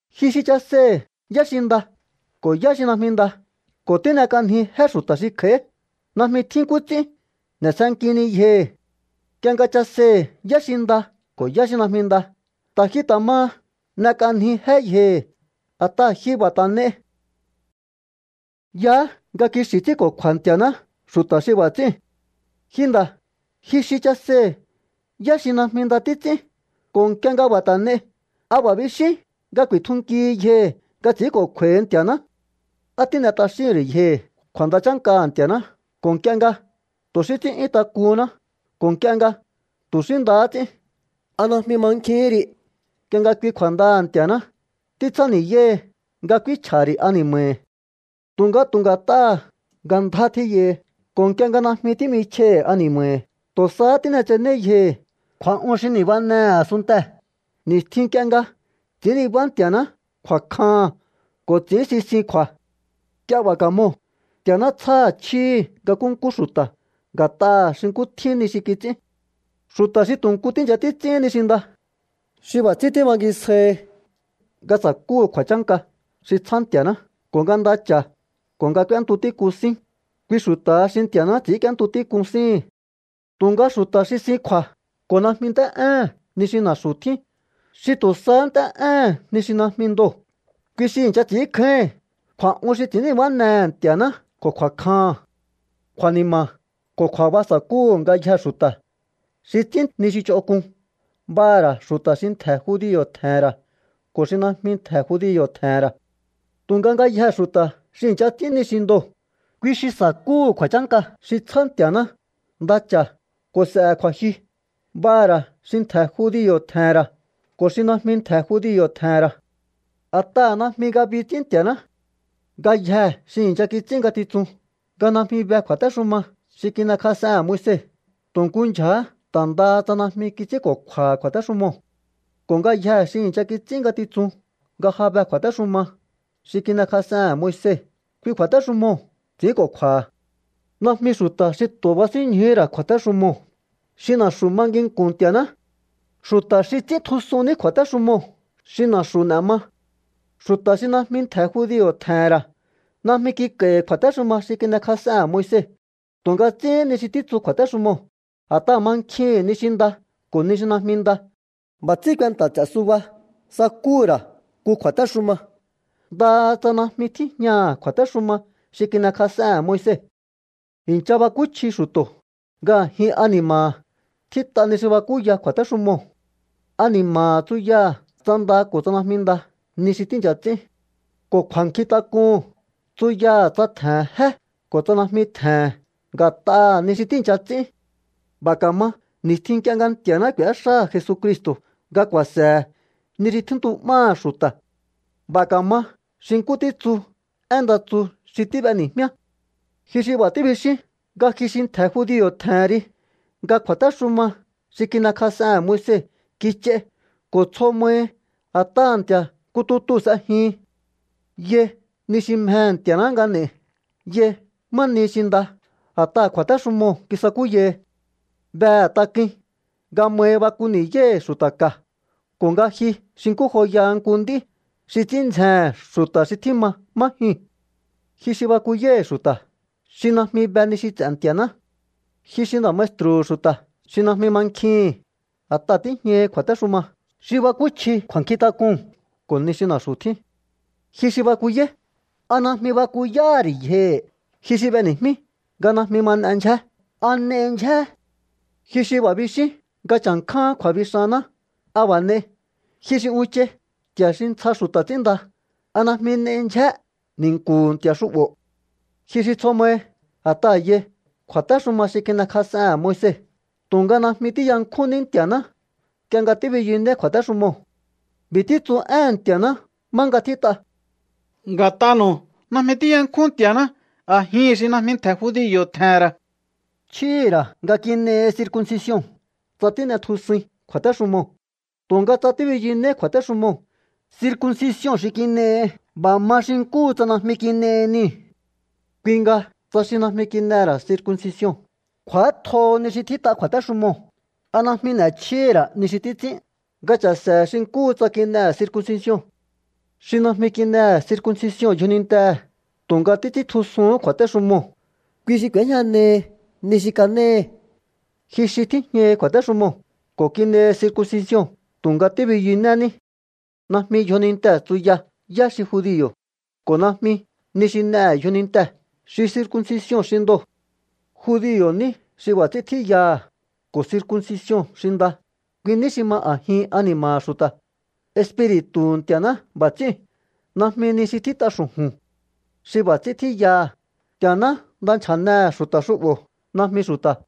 Ji xi chaseihi̱ yá xi nda ko̱ yá xi najmi nda ko̱ tín'ek'anji jé xu̱ta̱ xi kj'a̱í, najmi tjín nkú ts'ín n'e̱sjenkihini yjohi̱. Nk'ie nga chaseihi̱ yá xi nda ko̱ yá xi najmi nda, ta̱ ji ta̱ maha n'ek'anji jé yjohi̱, a̱t'aha̱ ji b'a̱ ta̱ n'ei. Yaá nga kixi̱ ts'ínko̱kju̱a̱ Nti̱a̱ná xu̱ta̱ xi b'a̱ ts'íu̱n. Ji nda̱, ji xi chaseihi̱ yá xi najmi nda títs'ín ko̱ nk'ie nga b'a̱ ta̱ n'ei, ¿a b'a̱ bixín nga ku̱i̱tjunkihi yjohi̱ nga ts'i̱ínko̱kju̱a̱hi Nti̱a̱ná? ¿Á tín'e t'axíhi̱n ri̱ yjohi̱ kju̱a̱nda chánkaha̱ Nti̱a̱ná ko̱ nk'ie nga tu̱ xí ts'ín'yún tak'uhúnná ko̱ nk'ie nga tu̱ xí ndahá ts'ín? ¿A najmi mankjihín ri nk'ie nga kui kju̱a̱ndaha̱ Nti̱a̱ná títsjáni̱yáhi nga k'úínchj'a̱ha̱ ri̱ ani̱ma̱hi̱? Tu̱nga tu̱ nga̱t'aha̱ nga ndjá tjíyahi ko̱ nk'ie nga najmi tí'michj'aihi̱ ani̱ma̱hi̱, tu̱ sahá tín'etsenéí yjohi̱ kju̱a̱'un xi ni̱banehe̱ a̱sunntee̱ ni̱stjin nk'ie nga ts'i̱ín nibá Nti̱a̱ná kju̱a̱kjaha̱n ko̱ ts'i̱ín sisin kju̱a̱. Nk'ie b'a̱ ka̱moo̱, Nti̱a̱ná tsjáha̱ chjíhi̱ nga nkúnkú xu̱ta̱ nga̱t'aha̱ xi nkú tjín ni xi kits'ín. Xu̱ta̱ xi tu̱ nku tíi̱ncha títs'íhín ni xi nda, xi b'a̱ ts'ín tíbangisjáíhi nga sa̱kúhu̱ kju̱a̱chánka xi tsjá Nti̱a̱ná ko̱ nga nda cha̱ ko̱ nga k'úéntu tík'un sín, kui xu̱ta̱ha xi Nti̱a̱ná ts'i̱ínk'íéntu tík'un síhi̱n. Tu̱nga xu̱ta̱ xi sin kju̱a̱ ko̱ najmi nt'é'éhe̱n ni xi na̱xu̱ tjín, xi tu̱ sahá nt'é'éhe̱n ni xi najmi ndoo̱, kui xi i̱ncha ts'i̱ínkjáíhi̱n kju̱a̱'un xi ts'i̱ín nibánehe̱ Nti̱a̱ná ko̱ kju̱a̱kjaha̱n. Kju̱a̱ni̱ma̱ ko̱ kju̱a̱ba sa̱kúhu̱ ngayjee̱ xu̱ta̱ xi ts'ín ni xi ch'onk'un, b'aha̱ ra̱ xu̱ta̱ xi ntje̱ judio̱ tje̱he̱n ra̱ ko̱ xi najmi ntje̱ judio̱ tje̱he̱n ra̱. Tu̱nga ngayjee̱ xu̱ta̱ xi i̱ncha ts'ín ni xi ndoo̱, kui xi sa̱kúhu̱ kju̱a̱chánka xi tsjá Nti̱a̱ná, nda cha̱ ko̱ s'e̱he̱ kju̱a̱jyu, b'aha̱ ra̱ xi ntje̱ judio̱ tje̱he̱n ra̱ ko̱ xi najmi ntje̱ judio̱ tje̱he̱n ra̱. A̱t'aha̱ namji ngabi ts'ín Nti̱a̱ná. Ngayjee̱ xi i̱ncha kits'ín ngatitsun nga najmi be kju̱a̱téxuma xi kin'ekj'asehe̱n Moise, tu̱ nkú ndyja̱há ta̱ ndaha tsa najmi kits'ínko̱kju̱a̱ha̱ kju̱a̱téxumoo̱. Ko̱ ngayjee̱ xi i̱ncha kits'ín ngatitsun nga ja be kju̱a̱téxuma xi kin'ekj'asehe̱n Moise, kui kju̱a̱téxumoo̱ ts'i̱ínko̱kju̱a̱ha̱. Najmi xu̱ta̱ xi tu̱ basínñjuhú ra̱ kju̱a̱téxumoo̱ xi na̱xu̱ ma nginku̱n Nti̱aná. Xu̱ta̱ xi ts'íntjusun ní kju̱a̱téxumoo̱ xi na̱xu̱ n'e̱ ma. Xu̱ta̱ xi najmi ntje̱ judio̱ tje̱he̱n ra̱ najmi kik'a̱i̱hi̱ kju̱a̱téxuma xi kin'ekj'asehe̱n Moise tu̱nga ts'íhín ni xi títsu kju̱a̱téxumo̱o, a̱t'aha̱ mankjihi̱n ni xi nda ko̱ ni xi najmi nda. B'a̱ ts'ín kuenta̱ ts'e̱ suba sakúhu̱ ra̱ nku kju̱a̱téxuma, ndaha tsa najmi tíjñaha̱ kju̱a̱téxuma xi kin'ekj'asehe̱n Moise. I̱ncha bakúchji xu̱to̱ nga a̱jin ani̱ma̱ha̱ tjít'a ni xi bakúya kju̱a̱téxumoo̱. Ani̱ma̱ha̱ tsuyaha̱ tsa nda ko̱ tsa najmi nda ni xi tíi̱ncha ts'ín. Ko̱ kju̱a̱nkjintak'uhu̱n tsuyaha̱ tsa tje̱he̱n jé ko̱ tsa najmi tje̱he̱n nga̱t'aha̱ ni xi tíi̱ncha ts'ín. B'a̱ ka̱ma ni̱stjin nk'ie nga Nti̱a̱ná k'u̱éxáha̱ Jesucristo̱ nga ku̱a̱se̱he ni xi tjíntu'máha̱ xu̱ta̱. B'a̱ ka̱ma xi nkú títsu én nda tsu xi tíb'eni̱jmíá. Ji xi b'a̱ tíbixín nga ji xi ntje̱ judio̱ tje̱hen ri, nga kju̱a̱téxuma xi kin'ekj'asehe̱n Moise kich'ai ko̱ tsjo mahi a̱t'aha̱ Nti̱a̱ nku tutuu̱ s'ejihin. Yai ni xi mjehe̱ Nti̱a̱ná nga n'e̱i. Yai má nihi xi nda a̱t'aha̱ kju̱a̱téxumoo̱ kisakúyahi. Behe̱ tak'uin nga mahi baku ni̱yáíhi̱ xu̱ta̱ ka̱ ko̱ nga ji xi nkú joyaha nku nd'í xi ts'ín ndzjehe̱n xu̱ta̱ xi tjíma má jyuu̱n. Ji xi bakuyáíhi̱ xu̱ta̱ xi najmi be ni xi ts'e̱ Nti̱a̱ná. Ji xi nda̱ maestru̱hu̱ xu̱ta̱ xi najmi mankjihi̱n, a̱t'aha̱ tíjñahi kju̱a̱téxuma xi bakúchji kju̱a̱nkjintak'uu̱n ko̱ ni xi na̱xu̱ tjín. Ji xi bakuyáí, ¿a najmi bakuyáha̱ ri̱ yjohi̱? Ji xi b'eni̱jmí nga najmi ma n'e ndyjé, ¿a n'ei ndyjé? Ji xi b'a̱ bixín nga cha̱nkjáán kju̱a̱bixanná, ¿a b'a̱ n'ei? Ji xi unchai nti̱a̱ xi ntsja xu̱ta̱ ts'ínnda, ¿a najmi n'ei ndyjé ni̱nku̱hu̱ nti̱a̱ xu'bo̱? Ji xi tsjo mahi a̱t'aha̱ yai kju̱a̱téxuma xi kin'ekj'asehe̱n Moise, tu̱nga najmi tíyankjúnní Nti̱a̱ná nk'ie nga tíbiyunéí kju̱a̱téxumoo̱. B'i̱ títsu éhe̱n Nti̱a̱ná má nga tjít'a: “Nga̱t'anu̱u najmi tíyankjún Nti̱a̱ná a̱jihi̱n xi najmi ntje̱ judio̱ tje̱he̱n ra̱.” Chjíhi̱ ra̱ nga kin'ehi circuncision tsa tín'etjusuin kju̱a̱téxumoo̱. Tu̱nga tsa tíbiyunéí kju̱a̱téxumoo̱, circuncision xi kin'ehi b'a̱ ma xi nkúhu tsa najmi kin'ehi niu̱. Kui nga tsa xi najmi kin'ehe̱ ra̱ circuncision kj'u̱átjoho ni xi tjít'a kju̱a̱téxumoo̱, ¿a najmi n'e̱chjíhí ra̱ ni xi títs'ín nga cha̱se̱he̱ xi nkúhu tsa kin'ehe̱ circuncision? Xi najmi kin'ehe̱ circuncision yjonintehe̱ tu̱nga títs'íntjusuhún kju̱a̱téxumoo̱, kui xi k'u̱éjñanehi ni xi kanéhi ji xi tíjñahi kju̱a̱téxumoo̱ ko̱ kin'ehi circuncision tu̱nga tíbiyunéní. Najmi yjonintee̱ tsuya yá xi judio̱, ko̱ najmi ni xi n'ehe̱ yjonintee̱ xi circuncision xi ndoo̱. Judio̱ ní xi b'a̱ ts'ín tjíyaha̱ ko̱ circuncision xi nda, kui ní xi ma a̱jin ani̱ma̱ha̱ xu̱ta̱. Espiri̱tu̱hu̱ Nti̱a̱ná b'a̱ ts'íu̱n, najmi ni xi tjít'a xu̱ju̱n. Xi b'a̱ ts'ín tjíyaha̱, Nti̱a̱ná nda nchja̱nehe̱ xu̱ta̱ xu'bo̱, najmi xu̱ta̱.